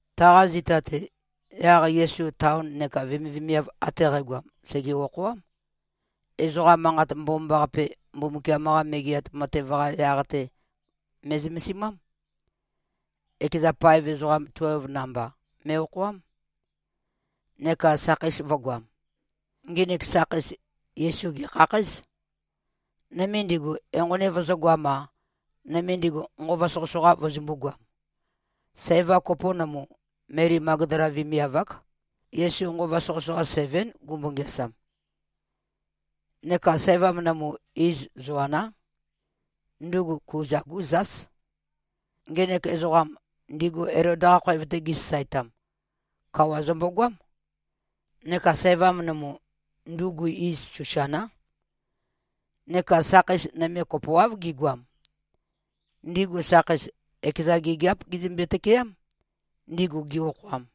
Taqa zita-te, yaq Yesu taon neka vemivemiav ate qægoam sège-okhoám. Ezoqa Manqat Mbomambaqape, Mbumbukiam-qa Megeat Matev-qa yaq-te me꞉zømesimám. Ekeza paev ezoqam tuelv namba me꞉-okhoám, neka sakheis vø̄goam. Nginik sakheis, Yesu gèkhakhǽz. Nøme ndigu, enqoni vøzø̄goam-a, nøme ndigu, nqova soqøsoqa vøzømbū-goam. Sævam kopo nømu, Meli Magdala vemiav-ák. Yesu nqova soqøsoqa sevén, gumbo-ngeasam. Neka sævam nømu, iz Zoaná. Ndugu Kuza-gú zás. Ngenek ezoqam, ndigu Elod-qa khoev-te gisasaetam, kawa zømbogoám. Neka sævam nømu, ndugu iz Susaná. Neka sakheis nøme kopoáv gigoam. Ndigu sakheis, ekeza gigiáp gizømbe-tøkeám, ndigu gi-okhoam.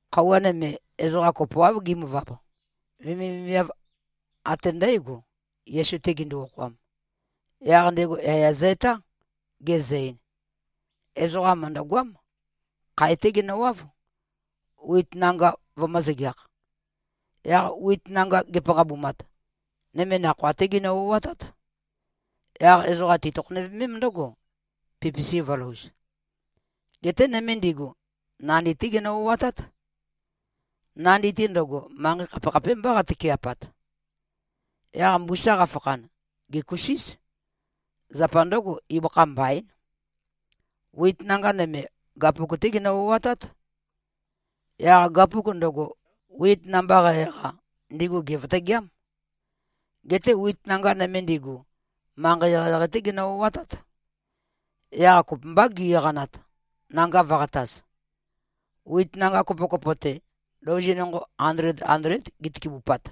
Khøuwa nøme, ezoqa kopoáv gimøvab. Vemivemiav ate ndǽgo, Yesu-te gindu-okhoam. Yaq ndego yaya zø-etá, gezø-ein, “Ezoqa mø̀ndøgoám. Khae-té genøwáv, wit nanga vømø̄-zøgeakh. Yaq wit nanga ge꞉panqabumat, nøme nakhoa-té ginø-o꞉atát. Yaq ezoqa tetøkhonøvemém ndǿgo, pipisi vø̄louz. Geté nøme ndigu, nandi-té ginø-o꞉atát. Nandi-te ndøgo, manqei khapekhapémbá qatøke꞉pat. Yaq mbusa qafakhan, gèkusíz. Zapa ndǿgo, ibøkha mbaín. Wit nanga nøme, gapuk-té ginø-o꞉atát. Yaq gapuk ndøgo, wit namba qæ-eqa, ndigu gèvøtøgeám. Geté wit nanga nøme ndigu, manqei eqeieqei-té ginø-o꞉atát. Yaq kopømbá gi-eqanat, nanga vø̄qataz. Wit nanga kopokopo-te, louzi nonqo andled-andléd gitøkebupat.”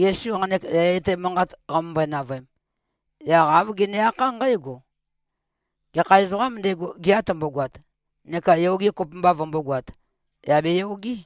Yesu nqanek yaya etæ manqat qamømbøe-navøem, yaq āv gene-akhá nqǽgo, “Gekha ezoqām ndego, gea tømbogoat neka yoge kopømba vømbógoāt, yà beyogé!”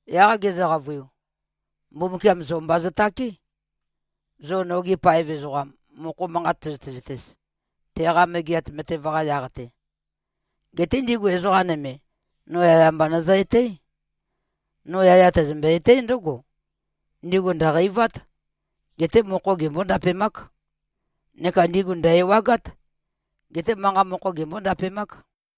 Yaq gezø-qavøiu, “Mbumbukiam zo mba zøtáke, zo nogi paev ezoqam, mokho manqat tøzøte-zøtez, teqa Megeat Matev-qa yaq-te. Geté ndigu ezoqa nøme, no yaya mba nøzø-etǽ. No yaya tæzømbe-etǽ ndǿgo: Ndigu ndø̀qeivát. Geté mokho gembó-ndapemák. Neka ndigu ndø̀-ewagát. Geté manqa mokho gembó-ndapemák.”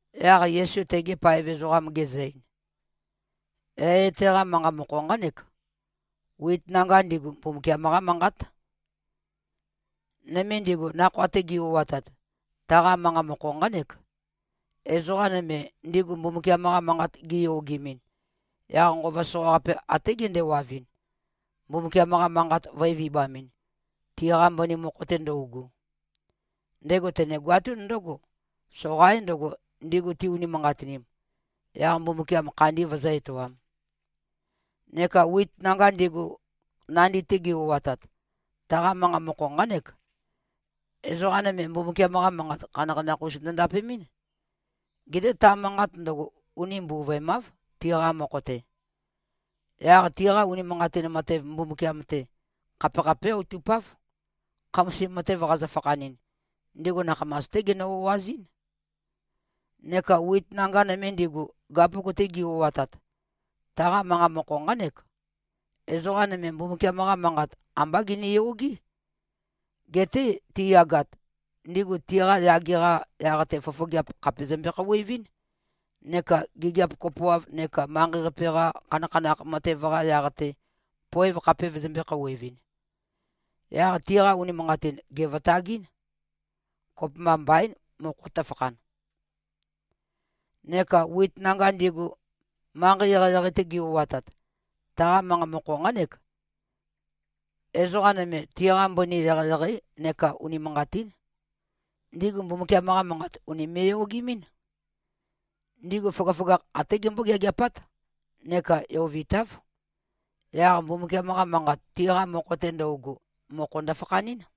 Yaq Yesu tegi paev ezoqam gezø-ein, “Yaya etæ-qa manqa mokho nqánek: Wit nanga ndigu, Mbumbukiam-qá Manqát. Nøme ndigu, nakhoa-te gi-o꞉atat, taqa manqa mokho nqánek: Ezoqa nøme, ndigu Mbumbukiam-qa Manqat giyogemɨn, yaq nqova soqaqape até gendewavɨn, Mbumbukiam-qa Manqat vø̄e-vibamɨn, tiqa mbøni mokho-te ndøugu. Ndego tenegoatún ndǿgo, soqaín ndǿgo, ndigu ti-unimanqatinim, yaq Mbumbukiam khandi vøzǿ-etoām. Neka wit nanga ndigu, nandi-te gi-o꞉atat, taqa manqa mokho nqánek: Ezoqa nøme, Mbumbukiam-qa Manqat khanakhanakh-us ndø-ndapemɨ́n. Geté ta manqat ndøgo, uni mbuvøemáv, tiqa mokho-te. Yaq tiqa unimanqatin matev Mbumbukiam-te, khapekhapé outupáv. Khamasim matev qazø-fakhanɨn, ndigu nakhamas-té ginø-o꞉azɨ́n. Neka wit nanga nøme ndigu, gapuk-te gi-o꞉atat, taqa manqa mokho nqánek: Ezoqa nøme, Mbumbukiam-qa Manqat ambá giniyogé. Geté tiyagat, ndigu tiqa yage-qa yaq-te fofogeap khàpe zømbe-khouwevɨ́n, neka gigiap kopoav neka manqei-qape-qa khanakhanakh matev-qa yaq-te, poev khape vøzømbē-khouwevɨn. Yaq tiqa unimanqatin gèvøtagɨ́n. Kopømba mbaín, mokho tøfakhan. Neka wit nanga ndigu, manqei eqeieqei-te gi-o꞉atat, taqa manqa mokho nqánek: Ezoqa nøme, tiqa mbøni eqeieqeí neka unimanqatín. Ndigu Mbumbukiam-qa Manqat ùnime꞉-yogemɨ́n. Ndigu føgøføgakh até gembó-geageapát neka yovitáv. Yaq Mbumbukiam-qa Manqat, tiqa mokho-te ndøugu, mokho ndøfakhanɨ́n.”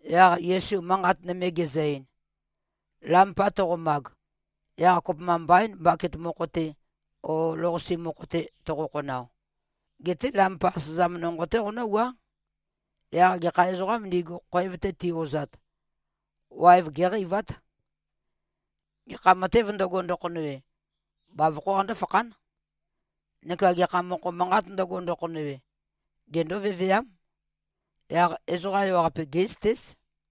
Yaq Yesu manqat nøme gezø-ein, “Lampa toqomag, yaq kopømba mbaín, baket mokho-te o lou-qase mokho-te toqo-khonao. Geté lampa asøzam nonqo-té qonǿwuá. Yaq gekha ezoqām ndigu, khoev-te ti-ozat, waev géqeivát. Gekha matēv ndøgo, ndøkhonøwe, bavokhó qandó-fakhán. Neka gekha mokho manqāt ndøgo, ndøkhonøwe, gendó-veveám. Yaq ezoqa ewaqape, gé꞉zøtéz.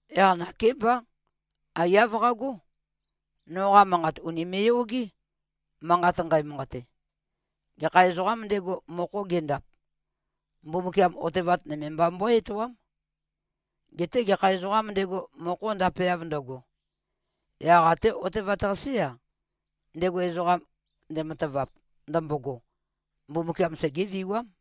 Yaq nakémbá, aiyá qagó. Noqa manqat ùnime꞉-yogé, manqat nqæmanqate. Gekha ezoqām ndego, mokho gendap, Mbumbukiam otevat nøme mba mbøé-etoám. Geté gekha ezoqām ndego, mokho ndapeav ndøgo, yaq até otevat-qasé-a, ndego ezoqam ndematavap ndømbogo, Mbumbukiam segéviwám.”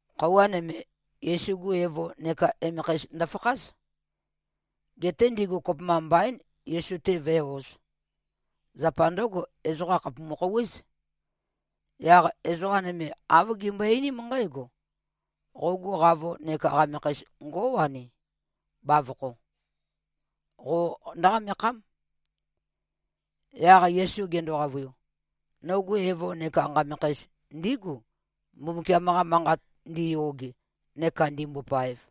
Khøuwa nøme, Yesu-gu evo neka emekheis ndøfakház. Geté ndigu kopømba mbaín, Yesu-te vǿe-ōz. Zapa ndǿgo, ezoqa khàpumu-khouwéz. Yaq ezoqa nøme, āv gimbøe-einím nqǽgo, “Qogu qavo neka qamekheis ngó꞉wani, bavokho. Qo ndǿqamekhám.” Yaq Yesu gendo-qavøiu, “Nogu evo neka nqamekheis ndígu, Mbumbukiam-qa Manqat ndiyoge neka ndimbopaev.”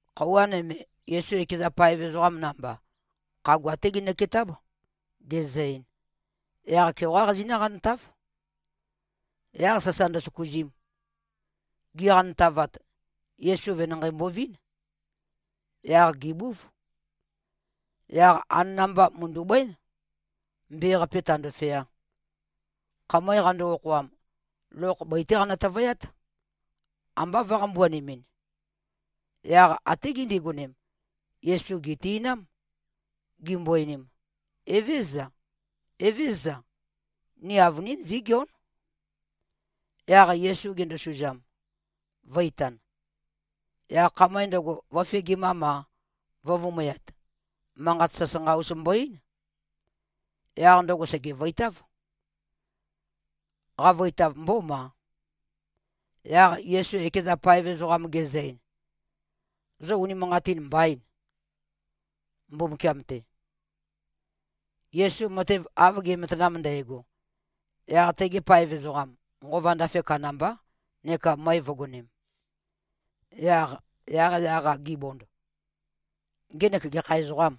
Khøuwa nøme, Yesu ekeza paev ezoqam namba, khagua-té ginøketáb, gezø-ein, “Yaq-keoqá qazinǿ-qantáv.” Yaq sasa ndøsøkuzim. Giqantavat, Yesu venanqei mbovín. Yaq gèbúv. Yaq anana-mba mø̀ndu꞉bǿen, mbe-qape tāndōfeā. Khamøe qando-okhoam, lokh bøi-té qanø-tøvøyát, ambá vø̄-qambuanemɨn. Yaq até gindigonem, Yesu gèti꞉nám, gimbo-einim, “Evézøza, Evézøza. Ni avønín zígeón.” Yaq Yesu gendosuzam, vø̄-itan. Yaq khamøe ndøgo, vø̄fegimam-a, vø̄vumøyat, manqat sasanqa-us mbo-eín. Yaq ndøgo sègevøitáv. Qavøitav mbómā. Yaq Yesu ekeza paev ezoqam gezø-ein, “Zo unimanqatin mbaîn, Mbumbukiam-te?” Yesu matev av ge꞉matanam ndægo, yaq tegi paev ezoqam, nqova ndafe kandambá neka møe vø̄gonem. Yaq, yaqyaq-a gibond, “Ngenek gekha ezoqâm?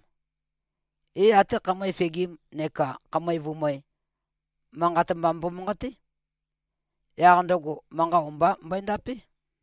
É, até khamøe fegim neka khamøe vumøe, manqat mba mbomanqaté. Yaq ndøgo manqa o-mba mbøendapé.”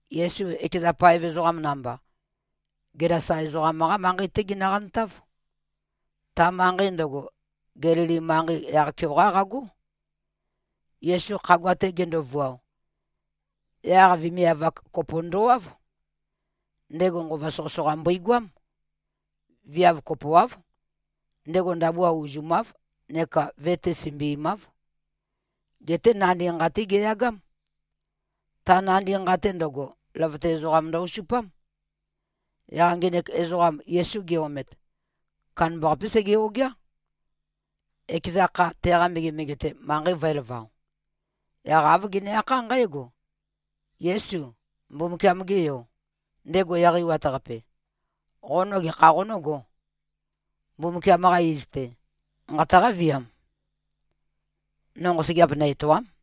Yesu ekeza paev ezoqam namba, Gelasa ezoqam-qá manqei-té ginøqantáv. Ta manqei ndøgo, Gelili manqei yaq-keoqá qagó. Yesu khagua-te gendovuao, yaq vemiav-ak kopo ndowáv. Ndego nqova soqøsoqa mbøigoám. Viav kopoáv, ndego ndabua uzumáv neka ve-te sømbimáv. Geté nandi nqa-té geyagám. Ta nandi nqa-te ndøgo, løvøte ezoqam ndø-osupám. Yaq ngenek ezoqam Yesu ge-omet, kandambaqapé sege-ogeá, ekeza kha, teqa megemege-te, manqei vø̄elavao. Yaq āv gene-akhá nqǽgo, “Yésu, Mbumbukiam-ge Yo, ndego Eqeiwat-Qape, qo no gekha qonǿgō? Mbumbukiam-qa iz-te, nqataqá-viam, no nqosøgeap nø-etòa᷄m.”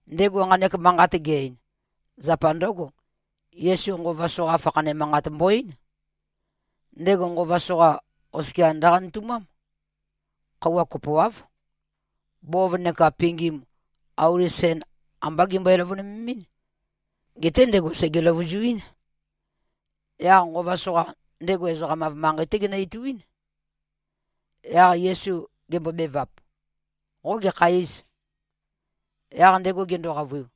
Ndego nqanek manqat ge-ein, zapa ndǿgo. Yesu nqova soqa fakhane manqat mbo-eín. Ndego nqova soqa oskia ndøqanøtumám. Khøuwa kopoáv. Bov neka pingim, auli sen ambá gimbøe-løvønøvememɨ́n. Geté ndego sège-løvuzuín. Yaq nqova soqa, ndego ezoqam-av manqei-té genø-ituín. Yaq Yesu gembobevap, “Qo gekha îz?” Yaq ndego gendo-qavøiu,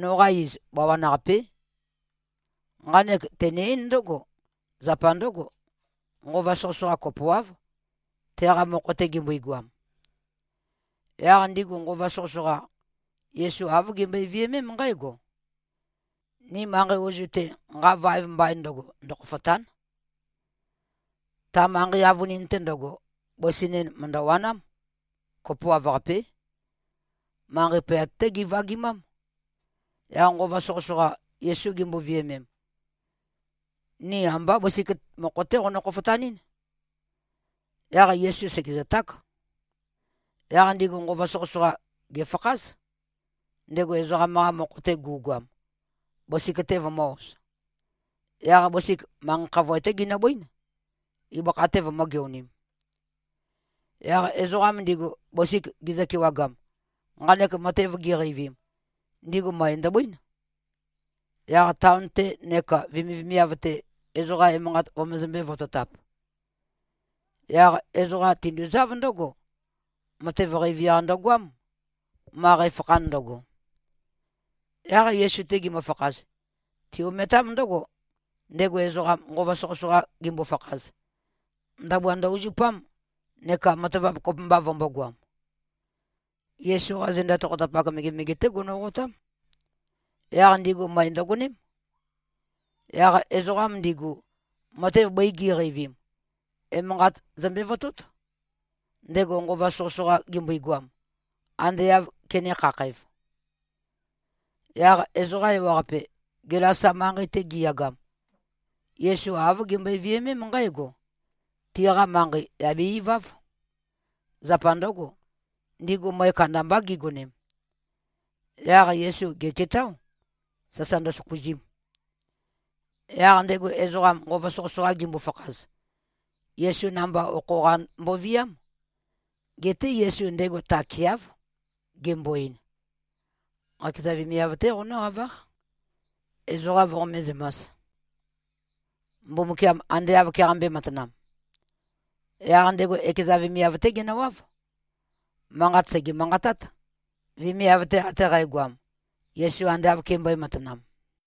“Noqa iz Bawan-qapé.” Nqanek tene-eín ndǿgo. Zapa ndǿgo, nqova soqøsoqa kopoáv, teqa mokho-te gimbøigoam. Yaq ndigu nqova soqøsoqa, Yesu āv gimbøe-viømém nqǽgo, “Ni manqei ozu-te, nqa vaev mbain ndøgo, ndøkhofòta᷄n.” Ta manqei avønin-te ndøgo, bøsi nen mø̀ndøwanám. Kopoav-qapé. Manqei poyat-té givagimám. Yaq nqova soqøsoqa, Yesu gimbo-viømem, “Ni ambá bøsik mokho-té qonø-khofotanɨ́n?” Yaq Yesu sègezøták. Yaq ndigu nqova soqøsoqa, gèfakház, ndego ezoqam-qa mokho-te gu꞉goam, bøsik-te vømø̄-oz. Yaq bøsik manqei khavoe-té ginøbøín, ibøkha-te vømø̄-geonim. Yaq ezoqam ndigu, bøsik gizø-kewagam, nqanek matev giqeivim, ndigu møe ndøbøín, yaq taon-te neka vemivemiav-te, ezoqa emanqat vømøzømbē-vototap. Yaq ezoqa tinduzáv ndǿgo. Matev qeivi-qa ndøgoám, ma qæfakhan ndøgo. Yaq Yesu-te gimøfakhaz, ti-ometám ndǿgo, ndego ezoqam, nqova soqøsoqa gimbo-fakhaz, ndabua ndø-uzupám neka matavap kopømba vømbōgoam. Yesu-qá zenda tokhotapak megemege-té gonoqotám. Yaq ndigu møe ndøgoném. Yaq ezoqam ndigu, matev bøi gi꞉qeivim, emanqat zømbe-votót, ndego nqova soqøsoqa gimbogoam, ande āv kenē-khakhæv. Yaq ezoqa ewaqape, Gelasa manqei-te giyagam, Yesu āv gimbøe-viømém nqǽgo. Tiqa manqei, yà be-iváv. Zapa ndǿgo, ndigu møe kandambá gigonem. Yaq Yesu gèketáo, sasa ndøsøkuzim. Yaq ndego ezoqam, nqova soqøsoqa gimbo-fakhaz, Yesu namba okho-qa mboviám. Geté Yesu ndego takeáv, gembo-ein, “Qakeza vemiav-té qonǿqaváq, ezoqa voqomé-zømās, Mbumbukiam ande āv keqambē-matanam.” Yaq ndego ekeza vemiav-té genøwáv. Manqat sège-manqatát, vemiav-te ate qægoam, Yesu ande āv kembøē-matanam.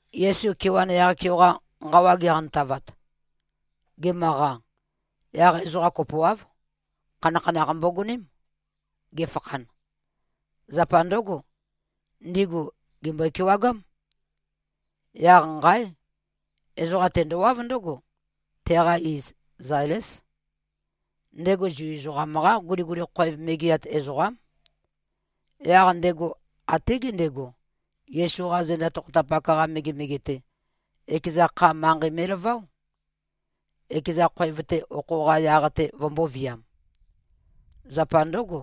Yesu kewan yaq-keoqa nqawa geqantavat, gemøqa, yaq ezoqa kopoáv, khanakhanakh mbogoném, ge꞉fakhan. Zapa ndǿgo, ndigu gèmbøe-kewagám. Yaq nqáe! Ezoqam tendowáv ndǿgo. Teqa iz Zailés. Ndego Zu ezoqam-qá guliguli khoev megeat ezoqám. Yaq ndego até gendego, Yesu-qa zenda tokhotapak-qa megemege-te, ekeza kha, manqei me꞉laváo, ekeza khoev-te okho-qa yaq-te vømbōviam. Zapa ndǿgo,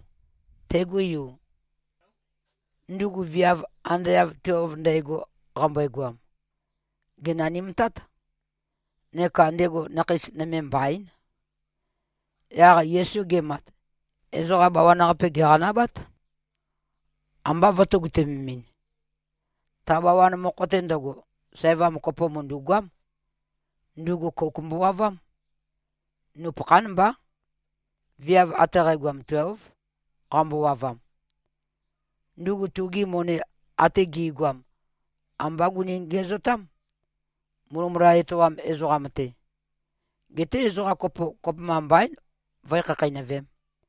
tegu yu, ndugu viav ande av tuelv ndægo qambøegoam, gènanimtát. Neka ndego nakheis nøme mbaín. Yaq Yesu gemat, ezoqa bawan-qape gèqanabát, ambá vø̄tøgutømemɨn. Ta bawan mokho-te ndøgo, sævam kopo mø̀ndu꞉goám. Ndugu kouk mbowavám. Nupøkhán mbá. Viav ate qægoam, tuélv, qambowavam. Ndugu tugi moni ate gi꞉goam ambá guni-ngiæzotám, mulømula etoam ezoqam-te. Geté ezoqa kopo, kopømba mbaín vǿe-khakheinøvēm.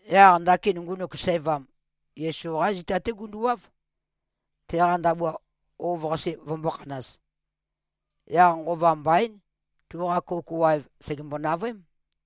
Yaq ndakin ngunuk sævam, Yesu-qá zita-té gunduwáv, teqa ndabua ov-qase vømbō-khanaz. Yaq nqova mbaín. Tuqa kouk waev, sègembo-navøém.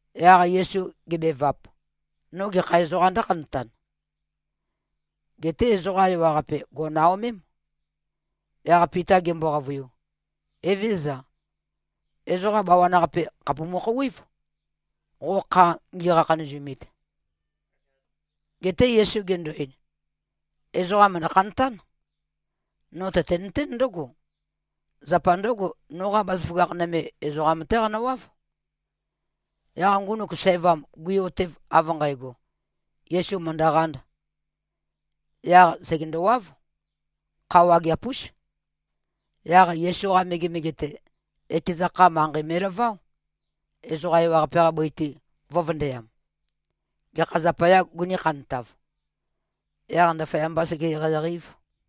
Yaq Yesu gebevap, “No gekha ezoqām ndǿkhantan?” Geté ezoqa ewaqape gò꞉naomém. Yaq Pita gembo-qavøiu, “Evézøza. Ezoqa bawan-qape khàpumu-khouwév, qoqa kha ngikhanazumit.” Geté Yesu gendo-ein, “Ezoqa mø̀ndø-khantán. No tøtenøtén ndǿgo. Zapa ndǿgo, noqa bazaføgakh nøme, ezoqam-té qanøwáv.” Yaq ngunuk sævam gui-otev av nqægo, Yesu mø̀ndøqānd, yaq sègendowáv. Kha wageap-ús. Yaq Yesu-qa megemege-te, ekeza kha, manqei me꞉laváo, ezoqa ewaqape-qa bøi-te vø̄vøndøyam, gekha zapayā gunī-khantav, yaq ndaføyambā sege-eqeieqei-ēv.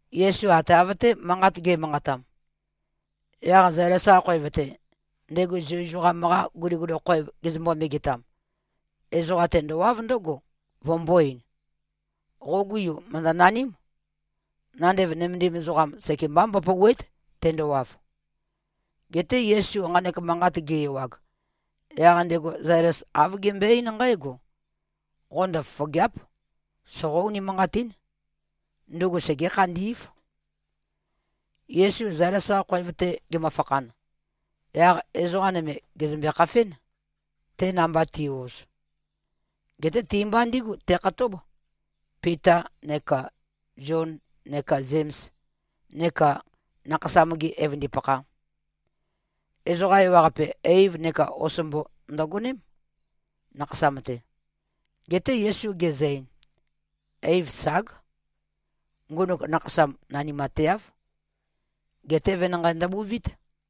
Yesu ate av-té manqat ge꞉manqatam, yaq Zailes-qa khoev-te, ndego Zu ezoqam-qa guliguli khoev gezømbo-megetam, ezoqam tendowáv ndǿgo, vømbō-ein, “Qogu yu mø̀ndønaním. Nandev nømendim ezoqam, sekemba mbopòuwe᷄꞉t, tendowav.” Geté Yesu nqanek manqat ge-ewag, yaq ndego Zailes āv gembøe-eín nqǽgo, “Qo ndøfofògea᷄p. Soqó-unimanqatín. Ndugu segé-khandí꞉v.” Yesu Zailes-qa khoev-te gemøfakhan, yaq ezoqa nøme gèzømbe-khafén, te namba ti꞉-oz. Geté ti-mba ndígu tekhatób, Pita neka Zion neka Zems, neka nakhasam-gi evøndipakha. Ezoqa ewaqape, eiv neka osombo ndøgoném, nakhasam-te. Geté Yesu gezø-ein, “Eiv ság! Ngunuk nakhasam nanimateáv. Geté venanqei ndøbuvít.”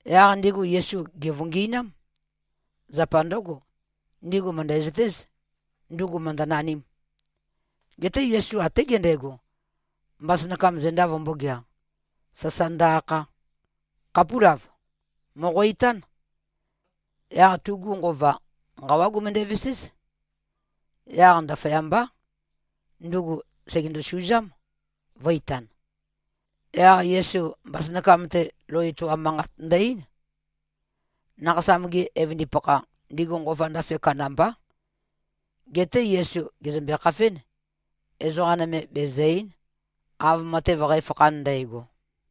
Yaq ndigu Yesu gèvøngi꞉nám. Zapa ndǿgo, ndigu mø̀ndæzøtéz, ndugu mø̀ndønanīm. Geté Yesu até gendego, mbasønakam zenda vømbōgea, sasa ndø-akha, “Khapúlav. Mòqo-itán!” Yaq tugu nqova, nqawá gumøndæ-veséz. Yaq ndaføyambá, ndugu sègendo-suzám, vø̄-itan. Yaq Yesu mbasønakam-te, lou etoam manqat ndø-eín. Nakhasam-gi evøndipakha, ndigu nqova ndafe kandambá. Geté Yesu gèzømbe-khafén. Ezoqa nøme bezø̀-ei᷄n, av matev qæfakhan ndægo.